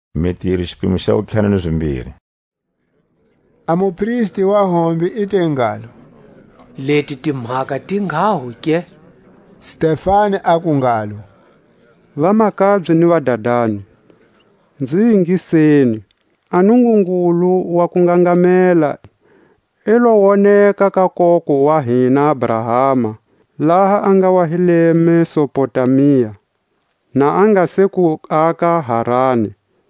A kutihlamulela ka Stefani. A mupristi wa hombe i te ngalo: Leti timhaka ti nghaho ke? Stefani aku ngalo: Vamakabye ni vadadani, nzi ingiseni. A Nungungulu wa kungangamela i lo woneka ka koko wa hina Abrahama, laha a nga wa hi le Mesopotamia, na a nga se ku aka Harani,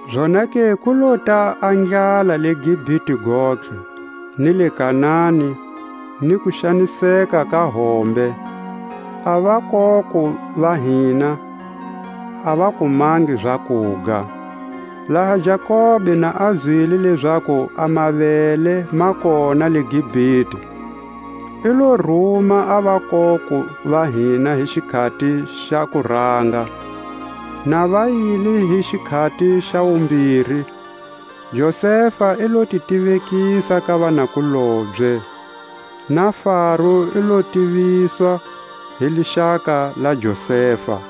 Zonake ku lota a ndlala le Gipite gontlhe, ni le Kanani, ni kuxaniseka ka hombe; a vakoko va hina a va kumangi zakuga. Laha Jakobe na a zwile lezaku a mavele ma kona le Gipite, i lo ruma a vakoko va hina hi xikhati xa kuranga. Na va yile hi xikhati xa wumbiri, Josefa i lo ti tivekisa ka vanakulobye; na Faro i lo tiviswa hi lixaka la Josefa.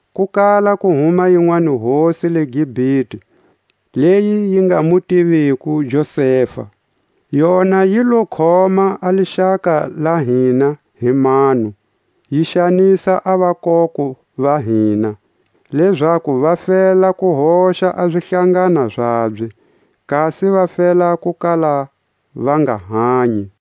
ku kala ku huma yinwanihosi le Gipite, leyi yi nga mu tiviko Josefa. Yona yi lo khoma a lixaka la hina hi mano, yi xanisa a vakoko va hina, lezaku va fela ku hoxa a zihlangana zabye, kasi va fela ku kala va nga hanyi.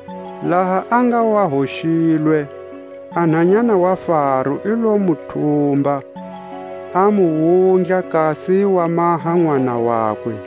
Laha a nga wa hoxilwe, a nhanyana wa Faro i lo mu thumba, a mu wundla kasi wa maha nʼwana wakwe.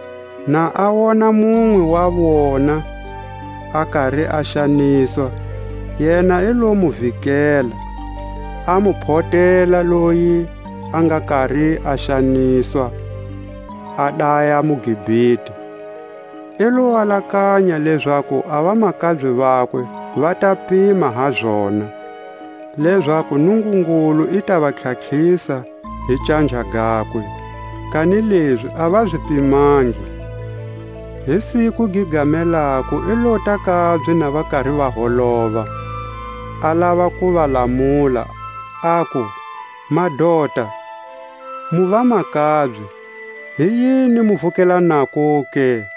Na a wona munwe wa vona a kari a xaniswa, yena i lo mu vikela, a mu photela loyi a nga kari a xaniswa, a daya muGipite. I lo alakanya lezaku a vamakabye vakwe va ta pima ha zona, lezaku Nungungulu i ta va tlhatlhisa hi canja gakwe, kanilezi a va zi pimangi. Hi siku gi gamelako i lota kabye na va kari va holova, a lava ku va lamula, aku: Madota, mu vamakabye; hi yini mu vukelanako ke?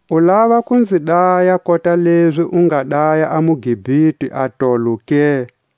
U lava ku nzi daya kota lezi u nga daya a muGipite atolo ke?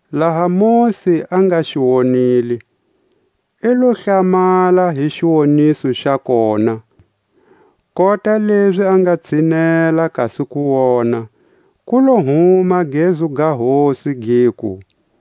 Laha Mosi a nga xi wonile, i lo hlamala hi xiwoniso xa kona; kota lezi a nga tshinela kasi ku wona, ku lo huma gezu ga Hosi, giku: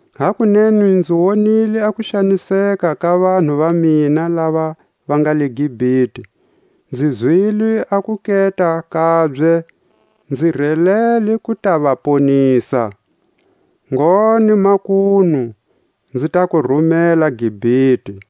Hakunene nzi wonile a kuxaniseka ka vanhu va mina lava va nga le Gipite, nzi zwile a kuketa kabye, nzi relele ku ta va ponisa. Ngone makunu, nzi ta ku rumela Gipite.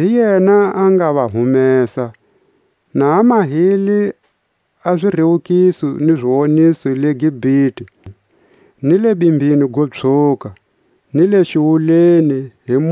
Hi yena a nga va humesa, na a mahile a zirewukiso ni ziwoniso le Gipite, ni le Bimbini go Pswhuka, ni le xiwuleni hi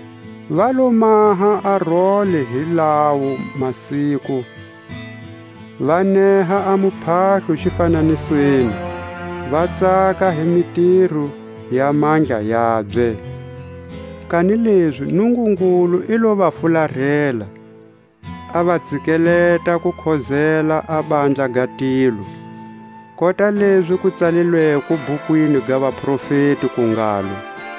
Va lo maha a role hi lawo masiku, va neha a muphahlo zifananisweni, va tsaka hi mitiro ya mandla yabye. Kanilezi Nungungulu i lo va fularela, a va tsikeleta ku khozela a handla ga tilo; kota lezi ku tsalilweko bhukwini ga vaprofeti, ku ngalo: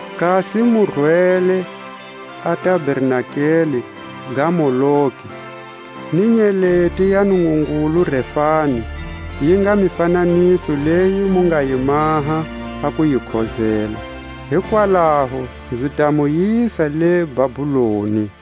Kasi mu rwele a tabernakeli ga Moloki, Ni nyeleti ya mingungulu Refani, Yi nga mifananiso leyi mu nga yi maha a ku yi khozela. Hikwalaho nzi ta mu yisa le Babuloni.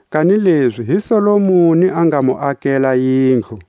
Kanilezi hi Solomoni a nga mu akela yindlu.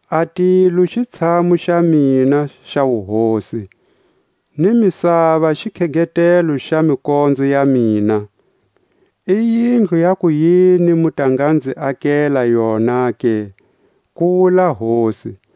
A tilo xitshamu xa mina xa wuhosi, Ni misava xikhegetelo xa mikonzo ya mina; I yindlu ya kuyini mu ta nga nzi akela yona ke? ku wula Hosi;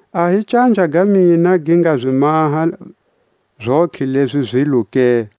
A hi canja ga mina gi nga zi maha zontlhe lezi zilo ke?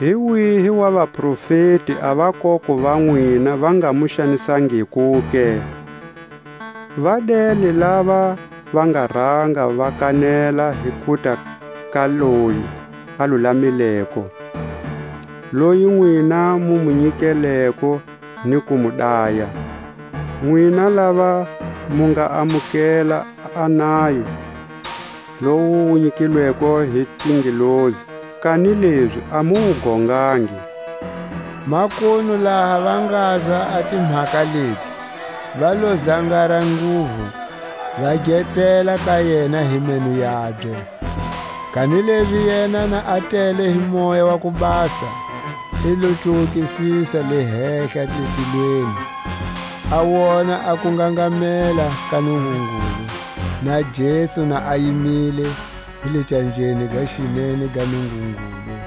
Hi wihi wa vaprofeti a vakoko va nwina va nga mu xanisangiko ke? Va dele lava va nga ranga va kanela hi kuta ka Loyi a Lulamileko; loyi nwina mu mu nyikeleko ni ku mu daya; nwina lava mu nga amukela a nayo lowu wu nyikilweko hi tingelosi, kanilezi a mu wu gongangi. Makunu laha va ngazwa a timhaka leti, va lo zangara nguvu, va getsela ka yena hi meno yabye. Kanilezi yena na a tele hi Moya wa ku Basa, i lo cuwukisisa le hehla le tilweni, a wona a kungangamela ka Nungungulu, na Jesu na a yimile hi le canjeni ga xinene ga Nungungulu,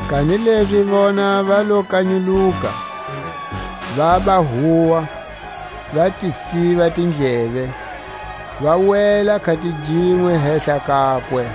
Kanilezi vona va lo kanyuluka, vaba huwa, va ti siva tindleve, va wela khatiginwe hehla kakwe;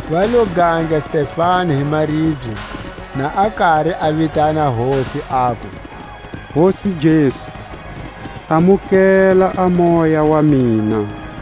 Va lo gandla Stefani hi maribye, na a kari a vitana Hosi, aku: Hosi Jesu, amukela a moya wa mina.